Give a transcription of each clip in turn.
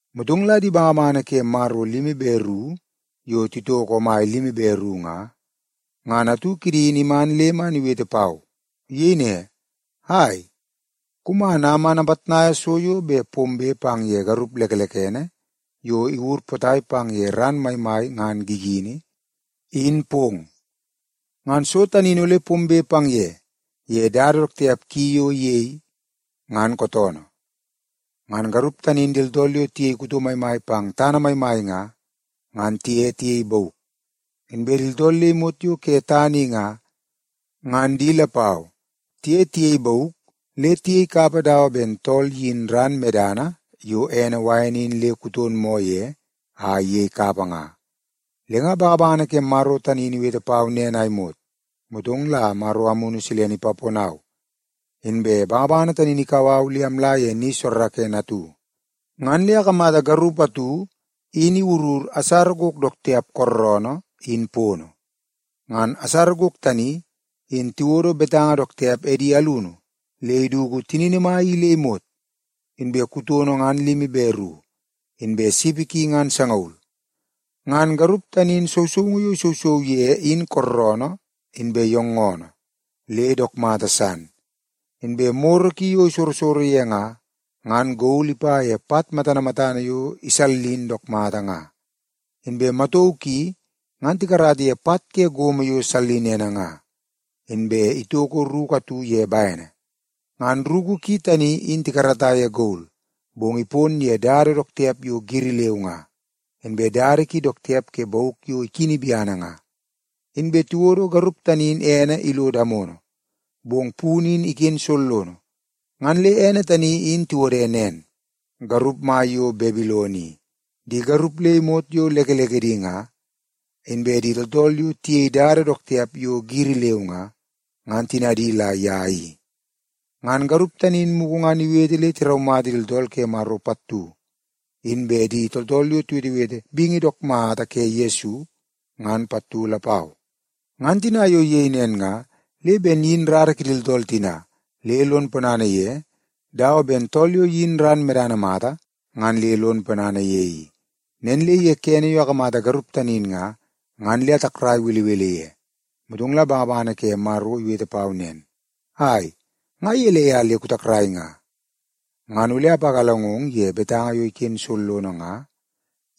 Motong la di bangabangana ke Maro limi be ru yo titoko omai limi be ru nga, ngan atu kidi in iman le man iwete pau. Iyei ne, “Ai, kuman a man apitnaia so yo bet pombe pang ye garup lekelekene yo iwur potai pang ye ran maimai ngan gigini, in pong. Ngan so tani in ole pombe pang ye, ye dada dook tiap ki yo iyei, ngan kootoonoo. Ngan garup tani in di tooltool yo tiyei kuto maimai pang tana maimai nga, ngan tiye tiyei bauk. Inbe di tooltool le imot yo ke tana i nga, ngan di lapau tiye tiyei bauk le tiyei kapa dawa ben tool iyini ran medana yo ene wain in le kuton moo ye a iyei kapa nga.” Le nga bangabangana ke Maro tani in iwete pau nen a imot, motong la Maro Amunu Silene ipaponau, inbe bangabangana tani in ikau au le amla ye ni soorookoonoo atu. Ngan le akamata garup atu in iwurur asara gok dook tiap kooroonoo in pono. Ngan asara gok tani, in tiwodo betanga dook tiap edi alunu le iduku tinini mai i le imot. Inbe kutono ngan limi be ru, inbe sipi ki ngan sangaul. Ngan garup tani in sousoungu yo isousou ye in kooroonoo inbe yoongoonoo le dook mata san. Inbe moro ki yo isorosoro ye nga, ngan gol ipa ye pat matana matana yo isallin dook mata nga. Inbe matauu ki ngan tikarata ye pat ke gomo yo sallinene nga. Inbe itoko ruku atu ye bene. Ngan ruku ki tani in tikarata ye gol, bong ipon ye dada dook tiap yo giri leu nga, inbe dada ki dook tiap ke bauk yo ikini biana nga. Inbe tiwodo garup tani in ene ilo damono, bong punu in iken sollono. Ngan le ene tani in tiwode nen: Garup Mai yo Babilon i. Di garup le imot yo lekelekedi nga, inbe di tooltool yo tiyei dada dook tiap yo giri leu nga, ngan tinadi la ye i. Ngan garup tani in mugu ngan iwete le tiraumata di tooltool ke Maro pattu, inbe di tooltool yo tiwetewete bingi dook mata ke Yesu, ngan pattu lapau. Ngan tina yo iyei nen nga, le ben iyin rara kidi tooltool tina le lon ponana ye dawa ben tool yo iyin ran medana mata ngan le lon ponana ye i. Nen le ye kene yo akamata garup tani in nga, ngan le atakrai belebele ye. Motong la bangabangana ke Maro iwete pau nen, “Ai, nga gelei a le kutakrai nga? Ngan ole apagalangong ye betanga yo iken sollono nga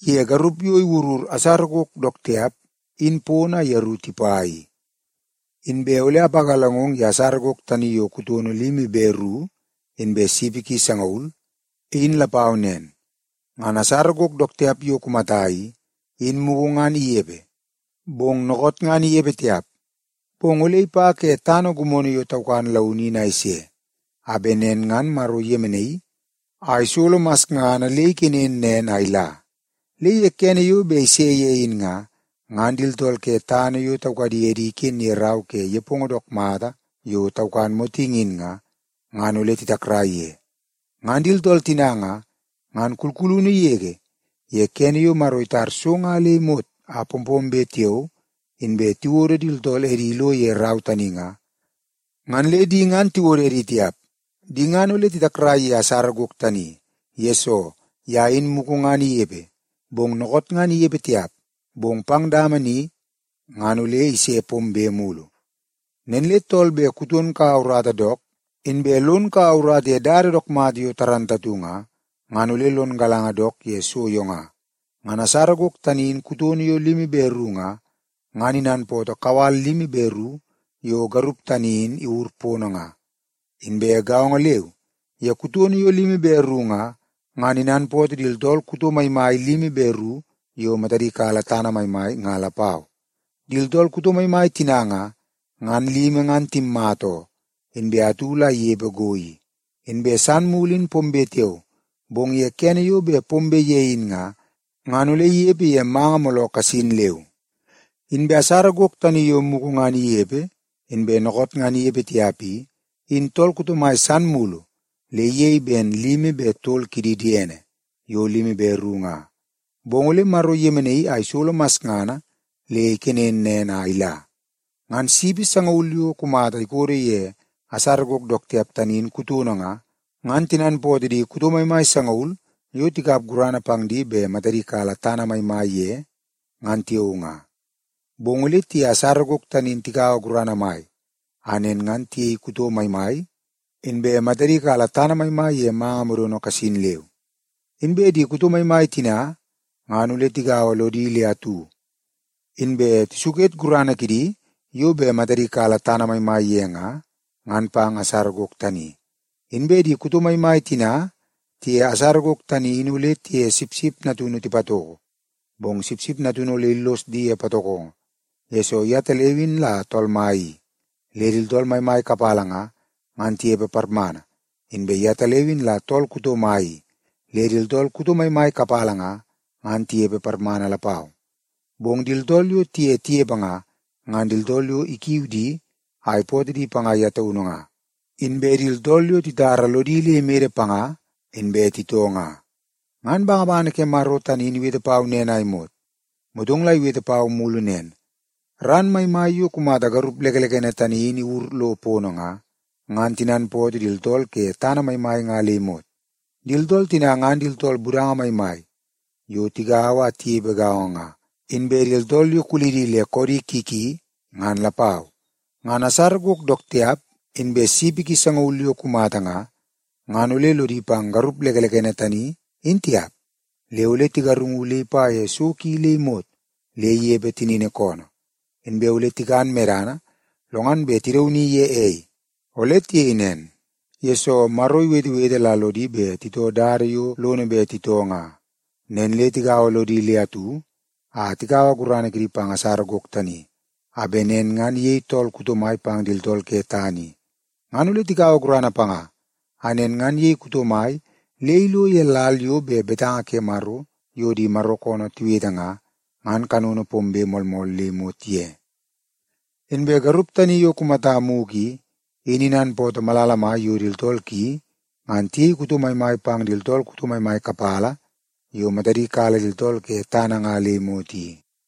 ye garup yo iwurur asara gok dook tiap in pono a yeru tipa i. Inbe ole ipagalangong ye asara gok tani yo kutono limi be ru inbe sipi ki sangaul, in lapau nen. Ngan asara gok dook tiap yo kumata i, in mugu ngan inepe, bong dookoot ngan inepe tiap. Bong ole ipa ke tana gimono yo taukan launu in a ise, a bet nen ngan Maro iyemenaii a isolo masngana le ikenen nen a ila. Le ye kene yo bet ise ye in nga, ngan di tooltool ke tana yo taukadi edi iken ye rau ke nepongo dook mata yo taukan motingi in nga, ngan ole titakrai ye. Ngan di tooltool tina nga, ngan kulkulunu yege ye kene yo Maro itar so nga le imot a pompombe tiao inbe tiwodo di tooltool edi ilo ye rau tani nga, ngan le di ngan tiwodo edi tiap. Di ngan ole titakrai ye asara gok tani, yesoo ye in mugu ngan inepe, bong dookoot ngan inepe tiap, bong pang dama ni ngan ole ise pombe mulu. “Nen le tool bet kuton kaua urata dook, inbe lon kaua urata ye dada dook mata yo moolmool nga, ngan ole lon galanga dook ye so yo nga. Ngan asara gok tani in kutono yo limi be ru nga, ngan inanpootoo kawal limi be ru yo garup tani in iwur pono nga. Inbe gaongo leu ye kutono yo limi be ru nga, ngan inanpootoo di tooltool kuto maimai limi be ru yo matadi kala tana maimai nga lapau. Di tooltool kuto maimai tina nga, ngan limi ngan timmata oo, inbe atu la inepe go i. Inbe san mulu in pombe tiao, bong ye kene yo bet pombe ye in nga, ngan ole inepe ye manga mooloo kasin leu. Inbe asara gok tani yo mugu ngan inepe inbe dookoot ngan inepe tiap i, in tool kuto mai san mulu le iyei ben limi be tol kidi diene yo limi be ru nga. Bong ole Maro iyemenaii a isolo masngana le ikenen nen a ila. “Ngan sipi sangaul yo kumata ikodo ye asara gok dook tiap tani in kutono nga, ngan tinanpootoo di kuto maimai sangaul yo tikap gurana pang di bet matadi kala tana maimai ye, ngan tiao nga. Bong ole tiye asara gok tani in tikaua gurana mai a nen ngan tiyei kuto maimai, inbe matadi kala tana maimai ye manga modono kasin leu. Inbe di kuto maimai tina ngan ole tigaua lodi le atu, inbe tisuket gurana kidi yo bet matadi kala tana maimai ye nga, ngan pang asara gok tani. Inbe di kuto maimai tina tiye asara gok tani in ole tiye Sipsip Natunu tipatoko. Bong Sipsip Natunu ole illos di ye patokongo, yesoo yetaleu in la Tool Mai i, le di tooltool maimai kapala nga, ngan tinepe parmana. Inbe yetaleu in la Tool Kuto Mai i, le di tooltool kuto maimai kapala nga, ngan tinepe parmana lapau. Bong di tooltool yo tiye tinepe nga, ngan di tooltool yo ikiu di a ipootoo di panga ye taunu nga, inbe di tooltool yo titara lodi le imede panga inbe titoo nga.” Ngan bangabangana ke Maro tani in iwete pau nen a imot, motong la iwete pau mulu nen, “Ran maimai yo kumata garup lekelekene tani in iwur lo pono nga, ngan tinanpootoo di tooltool ke tana maimai nga le imot. Di tooltool tina ngan di tooltool budanga maimai yo tigaua a tinepe gaongo nga, inbe di tooltool yo kulidi le koodi ki ki ngan lapau. Ngan asara gok dook tiap inbe sipi ki sangaul yo kumata nga, ngan ole lodi pang garup lekelekene tani in tiap. Le ole tigarungu le ipa ye so ki le imot le inepe tinini koonoo. Inbe ole tikan medana lo ngan bet tidauni ye ei. Ole tiyei nen, yesoo Maro iwetewete la lodi bet titoo dada yo lono bet titoo nga. Nen le tigaua lodi le atu a tikaua gurana kidi pang asara gok tani, a bet nen ngan iyei tool kuto mai pang di tooltool ke tana i. Ngan ole tikaua gurana panga a nen ngan iyei kuto mai le ilo ye lal yo bet betanga ke Maro yo di Maro koonoo tiwete nga, ngan kanono pombe moolmool le imot ye i. Inbe garup tani yo kumata mugu i, in inanpootoo malala mai yo di tooltool ki ngan tiyei kuto maimai pang di tooltool kuto maimai kapala yo matadi kala di tooltool ke tana nga le imot i.”